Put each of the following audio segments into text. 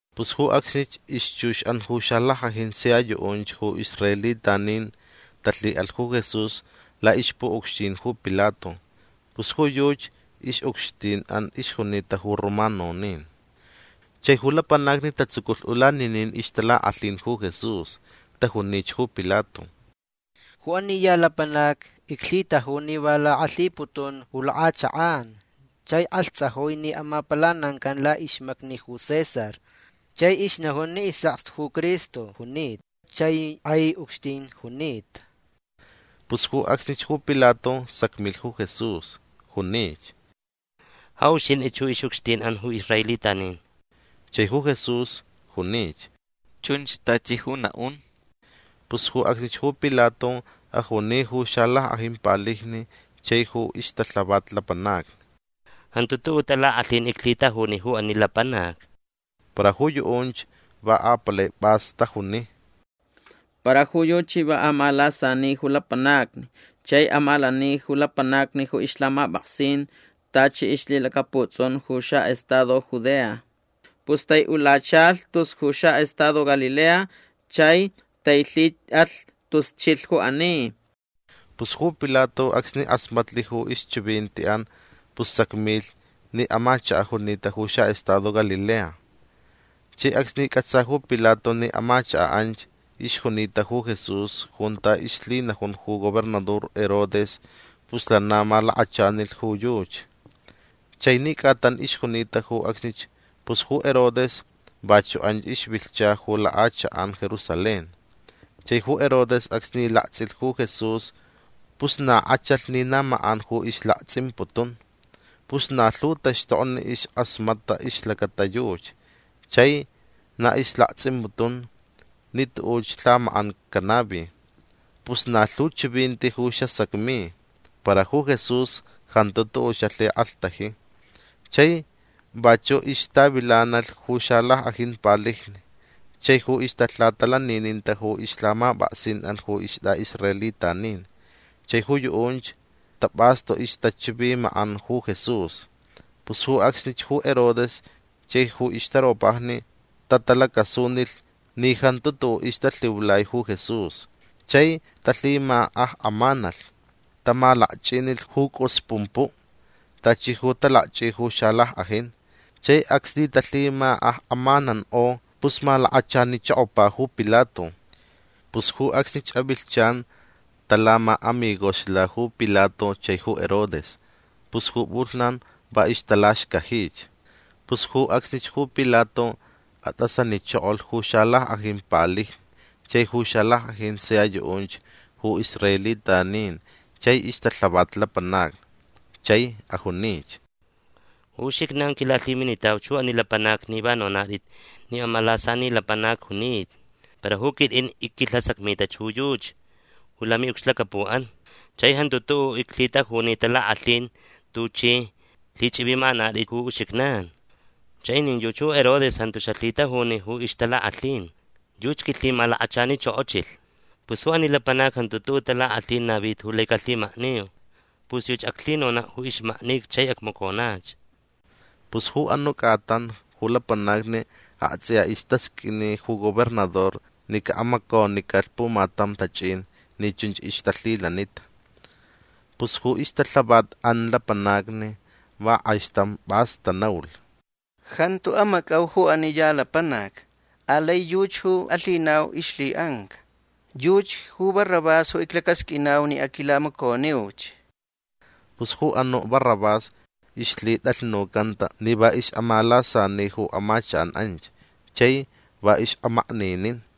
Pus ju acsnich ixchuxʼan ju xalackʼajin sia yuʼunch ju israelitanin talhiʼalh ju Jesús laʼixpuʼucxtin ju Pilato. Pus ju yuchi ixʼucxtinʼan ixjunita ju romanonin. Chai ju lapanacni tatsuculh ulaninin ixtalakʼalhin ju Jesús. Tajunich ju Pilato: ―Ju ani ya lapanac iclhitaju ni va lakʼalhiputun ju lakʼachakʼan chai kʼalhtsajui ni amapalanancan laʼixmacni ju César. Chai ixnajun ni isʼakstu ju Cristo junita chai kʼai ucxtin junita. Pus ju acsnich ju Pilato sacmilh ju Jesús. Junich: ―Ja uxintʼich ju ixʼucxtinʼan ju israelitanin. Chai ju Jesús junich: ―Chunch tachi ju naʼun. Pus ju acsnich ju Pilato ajuni ju xalackʼajin palijni chai ju ixtalhavat lapanacni: ―Jantu tuʼuʼ talakʼalhin iclhitajuni ju ani lapanac. Para ju yuʼunch va apalai pʼas tajuni: ―Para ju yuchi va amalasani ju lapanacni chai amalani ju lapanacni ju ixlhamapʼaksin tachi ixlhilacaputsʼun ju xaʼestado Judea. Pus taiʼulachalh tus ju xaʼestado Galilea chai tailhiʼalh tus chilh ju ani. Pus ju Pilato acsni kʼasmatlh ju ixchivintiʼan pus sacmilh ni amachakaʼ junita ju xaʼestado Galilea. Chai acsni cʼatsa ju Pilato ni amachakaʼ anch ixjunita ju Jesús junta ixlhinajun ju gobernador Herodes pus lana malakachanilh ju yuchi. Chai ni cʼatan ixjunita ju acsnich pus ju Herodes vachuʼ anch ixvilhcha ju lakʼachakʼan Jerusalén. Chai ju Herodes acsni laktsʼilh ju Jesús pus na kʼachalh ni na makʼan ju ixlaktsʼimputun. Pus na lhu taxtokni iskʼasmatʼa ixlacata yuchi chai na ixlaktsʼimputun ni tuʼuch lhamakʼan canavi. Pus na lhu chivinti ju xasacmi. Para ju Jesús jantu tuʼuʼ xalhikʼalhtaji. Chai vachuʼ ixtavilanalh ju xalackʼajin palijni chai ju ixtalhatalanininta ju ixlhamapʼaksinʼan ju istʼaʼisraelitanin. Chai ju yuʼunch tapʼastu ixtachivimakʼan ju Jesús. Pus ju acsnich ju Herodes chai ju ixtaropajni tatalacasunilh ni jantu tuʼuʼ ixtalhiulai ju Jesús. Chai talhimakʼakʼamanalh. Tamalakchʼinilh ju cʼusi pumpuʼ tachi ju talakchʼi ju xalackʼajin. Chai acsni talhimakʼakʼamanankʼo pus malakachanichokopa ju Pilato. Pus ju acsnich avilhchan talamaʼamigoxla ju Pilato chai ju Herodes. Pus ju pʼulhnan va ixtalaxcajich. Pus ju acsnich ju Pilato atʼasanichokolh ju xalackʼajin palijni chai ju xalackʼajin sia yuʼunch ju israelitanin chai ixtalhavat lapanacni. Chai ajunich: ―Ju uxijnan quilalhiminitauch ju ani lapanac ni va nonatʼit ni amalasani lapanac junita. Para ju quitʼin icquilhasacmita ju yuchi ju lamiʼucxlacapuʼan chai jantu tuʼuʼ iclhitajuni talakʼalhin tuchʼi lhichʼivimakʼanatʼit ju uxijnan. Chai nin yuchi ju Herodes jantu xalhitajuni ju ixtalakʼalhin. Yuchi quilhimalakachanichokochilh. Pus ju ani lapanac jantu tuʼuʼ talakʼalhin navita ju lai calhimakni. Pus yuchi aclhinonaʼ ju ixʼulanica chai acmaconach. Pus ju anuʼ cʼatan ju lapanacni aktsʼiya istasqʼuini ju gobernador ni caʼamaconicalh pumatam tachʼin ni chunch ixtalhilanita. Pus ju ixtalhavatʼan lapanacni va kʼaixtam pʼas tanaulh: ―Jantu amacʼau ju ani ya lapanac. Alai yuchi ju alhinauch ixlhiʼanca. Yuchi ju Barrabás ju iclacasqʼuinau ni aquilamaconiuch. Pus ju anuʼ Barrabás ixlhitʼalhnucanta ni va ixʼamalasani ju amachakʼan anch chai va ixʼamakninin.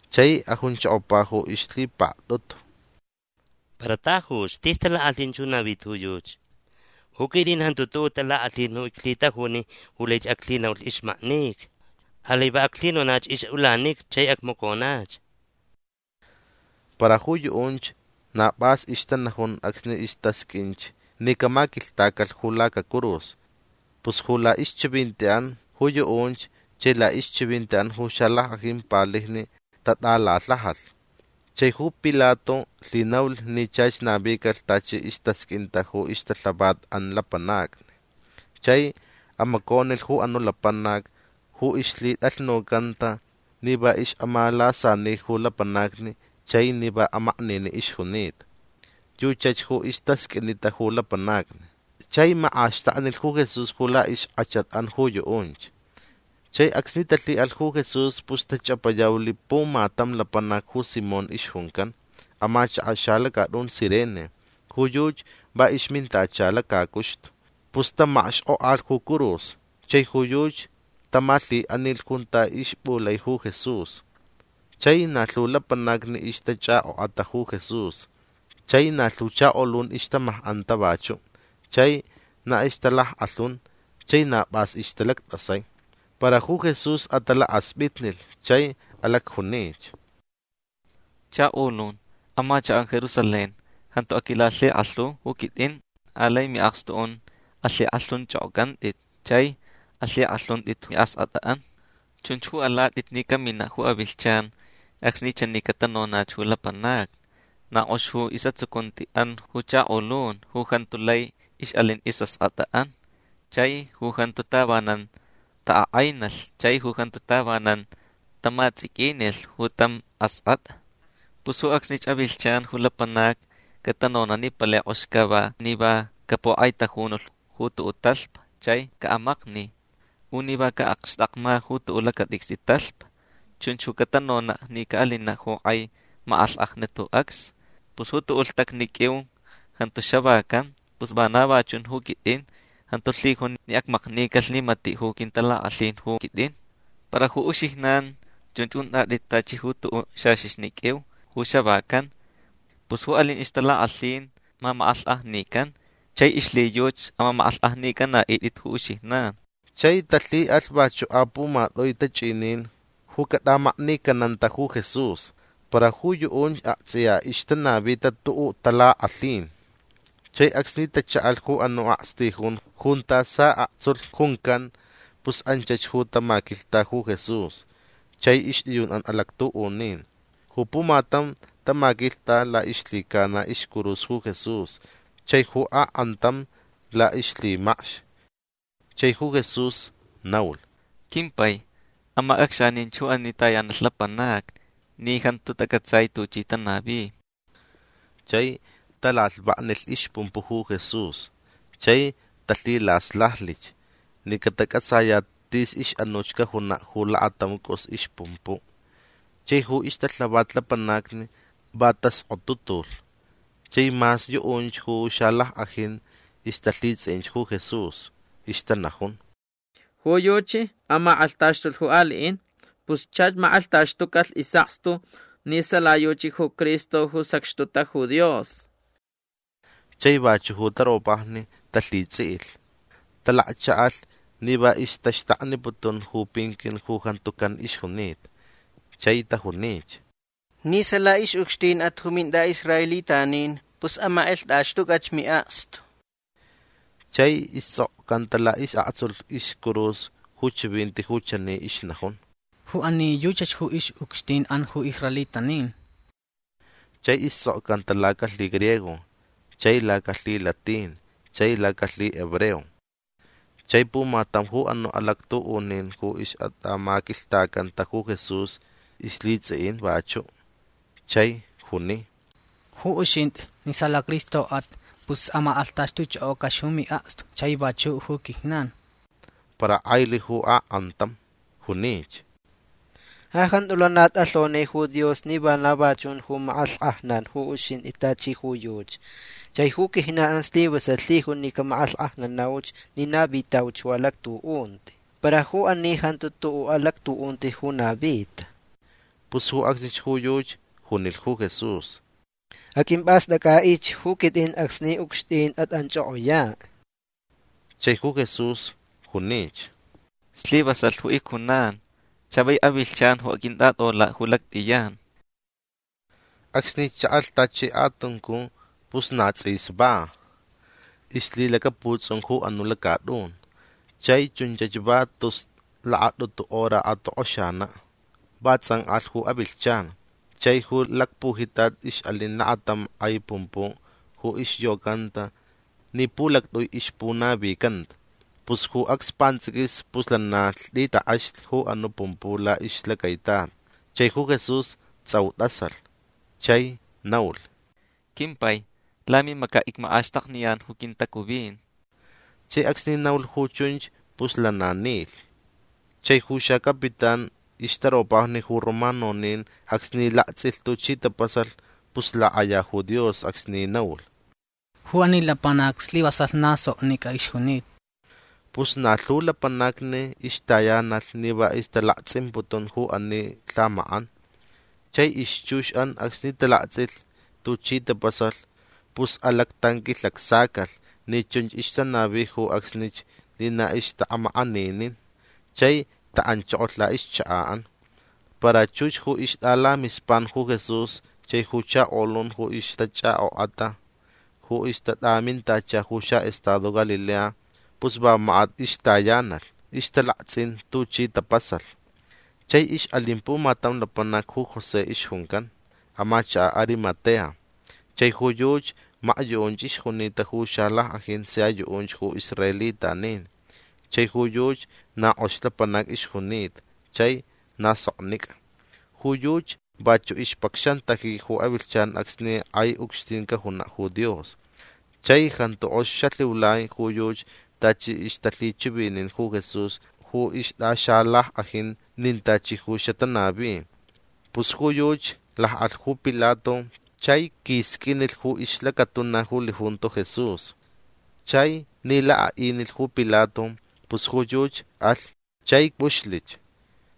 Chai ajunchokopa ju ixlhipaktʼutu: ―Para tajuch. Tis talakʼalhin ju navita ju yuchi. Ju quitʼin jantu tuʼuʼ talakʼalhin ju iclhitajuni ju lai aclhinaulh ixmaknica. Alai va aclhinonach ixʼulanica chai acmaconach. Para ju yuʼunch na pʼas ixtanajun acsni istasqʼuinch ni camaquilhtacalh ju lacacurus. Pus ju laʼixchivintiʼan ju yuʼunch chai laʼixchivintiʼan ju xalackʼajin palijni tatʼalalhajalh. Chai ju Pilato lhinaulh ni chach navicalh tachi istasqʼuinta ju ixtalhavatʼan lapanacni. Chai amaconilh ju anuʼ lapanac ju ixlhitʼalhnucanta ni va ixʼamalasani ju lapanacni chai ni va amakniniʼ ixjunita. Yuchach ju istasqʼuinita ju lapanacni. Chai makʼaxtaklich ju Jesús ju laʼixkʼachatʼan ju yuʼunch. Chai acsni talhiʼalh ju Jesús pus tachʼapayaulh pumatam lapanac ju Simón ixjuncan. Amachakaʼ xalacatʼun Cirene. Ju yuchi va ixmintacha lacacuxtu. Pus tamakxkʼokʼalh ju curus chai ju yuchi tamalhiʼanilh junta ixpʼulai ju Jesús. Chai na lhu lapanacni ixtachʼakʼokʼata ju Jesús. Chai na lhu chakolun ixtamakʼanta vachuʼ chai na ixtalackʼalhun chai na pʼas ixtalactʼasai. Para ju Jesús atalakaspʼitnilh chai alacjunich: ―Chakolun amachakʼan Jerusalén jantu aquilalhikʼalhu ju quitʼin. Alai miʼakstuʼan alhikʼalhunchʼokʼocʼantʼit. Chai alhikʼalhuntʼit ju miʼaskʼatʼan. Chunch ju alatʼit ni caminaʼ ju avilhchan acsni chani catanonach ju lapanacni: “Na kʼox ju isʼatsucuntiʼan ju chakolun ju jantu lai ixʼalin ju isʼaskʼatʼa chai ju jantu tavanan taʼakʼainalh chai ju jantu tavanan taʼamatsʼiquinilh ju tam askʼatʼa”. Pus ju acsnich avilhchan ju lapanacni catanonaʼ ni palai kʼox cava ni va capukʼaitajunulh ju tuʼuʼ talhpa chai caʼamakni. U ni va caʼakxtakma ju tuʼuʼ lacatʼicstʼi talhpa. Chunch catanonaʼ ni caʼalinaʼ ju kʼai makʼalhkʼajnat ju acsni. Pus ju tuʼuʼ lhtacni qʼuiu jantu xavacan. Pus vana va chun ju quitʼin. Jantu lhijun ni acmaknicalh ni matiʼ ju quintalakʼalhin ju quitʼin. Para ju uxijnan chunch untʼatʼit tachi ju tuʼuʼ xaxixni qʼuiu ju xavacan. Pus ju alin ixtalakʼalhin mamakʼalhkʼajnican. Chai ixlhiyuchi amamakʼalhkʼajnicʼanaʼitʼit ju uxijnan. Chai talhiʼalh vachuʼ apumatʼui tachʼinin ju catʼamaknicananta ju Jesús. Para ju yuʼunch aktsʼiya ixtanavita tuʼuʼ talakʼalhin. Chai acsni tachaʼalh ju anuʼ akstijun junta saʼaktsulh juncan pus anchach ju tamaquilhta ju Jesús chai ixtʼiyunʼan alactuʼunin. Ju pumatam tamaquilhta laʼixlhicana iscurus ju Jesús. Chai ju akʼantam laʼixlhimacx. Chai ju Jesús naulh: ―Quimpai amacʼacxaninch ju ani tayanalh lapanacni ni jantu tacʼatsai tuchi tanavi. Chai talalhvaknilh ixpumpuʼ ju Jesús. Chai talhilaslajlich ni catacʼatsayaʼ tis ixʼanuch cajunaʼ ju lakatam cʼus ixpumpuʼ. Chai ju ixtalhavat lapanacni va taskʼotutulh. Chai mas yuʼunch ju xalackʼajin ixtalhitsʼiʼinch ju Jesús. Ixtanajun: ―Ju yuchi amakʼalhtaxtulh ju aliʼin. Pus chach makʼalhtaxtucalh isʼakstu ni sala yuchi ju Cristo ju sacxtuta ju Dios. Chai vachuʼ ju taropajni talhitsʼiʼilh. Talakchaʼalh ni va ixtaxtakniputun ju pinquin ju jantu can ixjunita. Chai tajunich: ―Ni sala ixʼucxtinʼat ju mintʼaʼisraelitanin pus amakʼalhtʼaxtʼucʼach miʼakstu. Chai istsʼokcanta laʼisʼaktsulh iscurus ju chivinti ju chani ixnajun: “Ju ani yuchach ju ixʼucxtinʼan ju israelitanin”. Chai istsʼokcanta lacalhigriego chai lacalhilatin chai lacalhihebreo. Chai pumatam ju anuʼ alactuʼunin ju ixʼatʼamaquilhtacanta ju Jesús ixlhitsʼiʼin vachuʼ. Chai juni: ―Ju uxintʼi ni sala Cristoʼat pus amakʼalhtʼaxtʼuchʼokʼocʼach ju miʼakstu chai vachuʼ ju quijnan. Para kʼailh ju akʼantam. Junich: ―Ja jantu lana tʼalhoni ju Dios ni vana va chun ju makʼalhkʼajnan ju uxintʼi tachi ju yuchi. Chai ju quijnanʼan islivasalh lhijun ni camakʼalhkʼajnanauch ni navitauch ju alactuʼunti. Para ju ani jantu tuʼuʼ alactuʼunti ju navita. Pus ju acsnich ju yuchi junilh ju Jesús: ―Aqʼuimpʼastʼacʼaʼich ju quitʼin acsni ucxtin atʼanchʼokʼoyaʼ. Chai ju Jesús junich: ―Slivasalh ju icjunan. Chavai avilhchan ju aqʼuintʼatʼolaʼ ju lactʼiyan. Acsni chaʼalh tachi kʼatuncu pus na tsʼis va ixlhilacaputsʼun ju anuʼ lacatʼun. Chai chunchach va tus lakatʼutu hora atokʼoxanaʼ. Va tsʼankʼalh ju avilhchan. Chai ju lacpujitat ixʼalin lakatam kʼai pumpuʼ ju ixyocanta ni pulactʼui ixpunavicanta. Pus ju acs pantsʼiquis pus lana lhtʼit takʼexlh ju anuʼ pumpuʼ laʼixlacaitat. Chai ju Jesús tsʼau tʼasalh. Chai naulh: ―Quimpai lamimacaʼ icmakʼaxtakniyan ju quintacuvin. Chai acsni naulh ju chunch pus lana nilh. Chai ju xacapitán ixtaropajni ju romanonin acsni laktsʼilh tuchi tapasalh pus lakʼaya ju Dios acsni naulh: ―Ju ani lapanac slivasalh na soknicʼa ixjunita. Pus na lhu lapanacni ixtayanalh ni va ixtalaktsʼimputun ju ani lhamakʼan. Chai ixchuxʼan acsni talaktsʼilh tuchi tapasalh pus alactanquilhacsacalh ni chunch ixtanavi ju acsnich ni na ixtaʼamakʼaninin. Chai taʼanchokolh laʼixchakaʼan. Para chux ju ixtʼalamispan ju Jesús chai ju chakolun ju ixtachʼakʼokʼata ju ixtatʼamintacha ju xaʼestado Galilea pus va makat ixtayanalh. Ixtalaktsʼin tuchi tapasalh. Chai ixʼalin pumatam lapanac ju José ixjuncan. Amachakaʼ Arimatea. Chai ju yuchi makyuʼunch ixjunita ju xalackʼajin sia yuʼunch ju israelitanin. Chai ju yuchi na kʼox lapanac ixjunita chai na soknicʼa. Ju yuchi vachuʼ ixpacxantaji ju avilhchan acsni kʼai ucxtin cajunaʼ ju Dios. Chai jantu kʼox xalhiulai ju yuchi tachi ixtalhichivinin ju Jesús ju ixtʼaxalackʼajin nin tachi ju xatanavi. Pus ju yuchi lakʼalh ju Pilato chai quisqʼuinilh ju ixlacatuna ju lijunto Jesús. Chai ni lakʼaʼinilh ju Pilato pus ju yuchi alh chai pʼuxlich.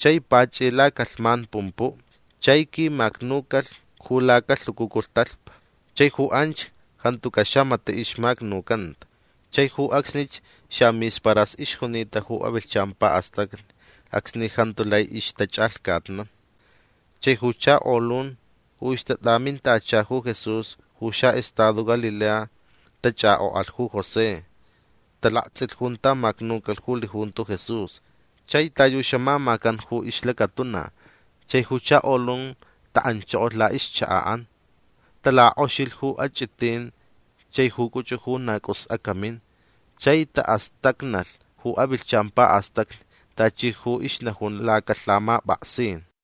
Chai pachʼi lacalhman pumpuʼ. Chai quimacnucalh ju lacalhucucu talhpa. Chai ju anch jantucaʼ xamatiʼ ixmacnucanta. Chai ju acsnich xamisparas ixjunita ju avilhchan paʼastacni acsni jantu lai ixtachʼalhcatnan. Chai ju chakolun ju ixtatʼamintacha ju Jesús ju xaʼestado Galilea tachʼakʼokʼalh ju José. Talaktsʼilh junta macnucalh ju lijunto Jesús chai ta yu xamamacan ju ixlacatuna. Chai ju chakolun taʼanchokolh laʼixchakaʼan. Talakʼoxilh ju achʼitin chai ju cʼuchʼu ju na cʼus acamin. Chai taʼastacnalh ju avilhchan paʼastacni tachi ju ixnajun lacalhamapʼaksin.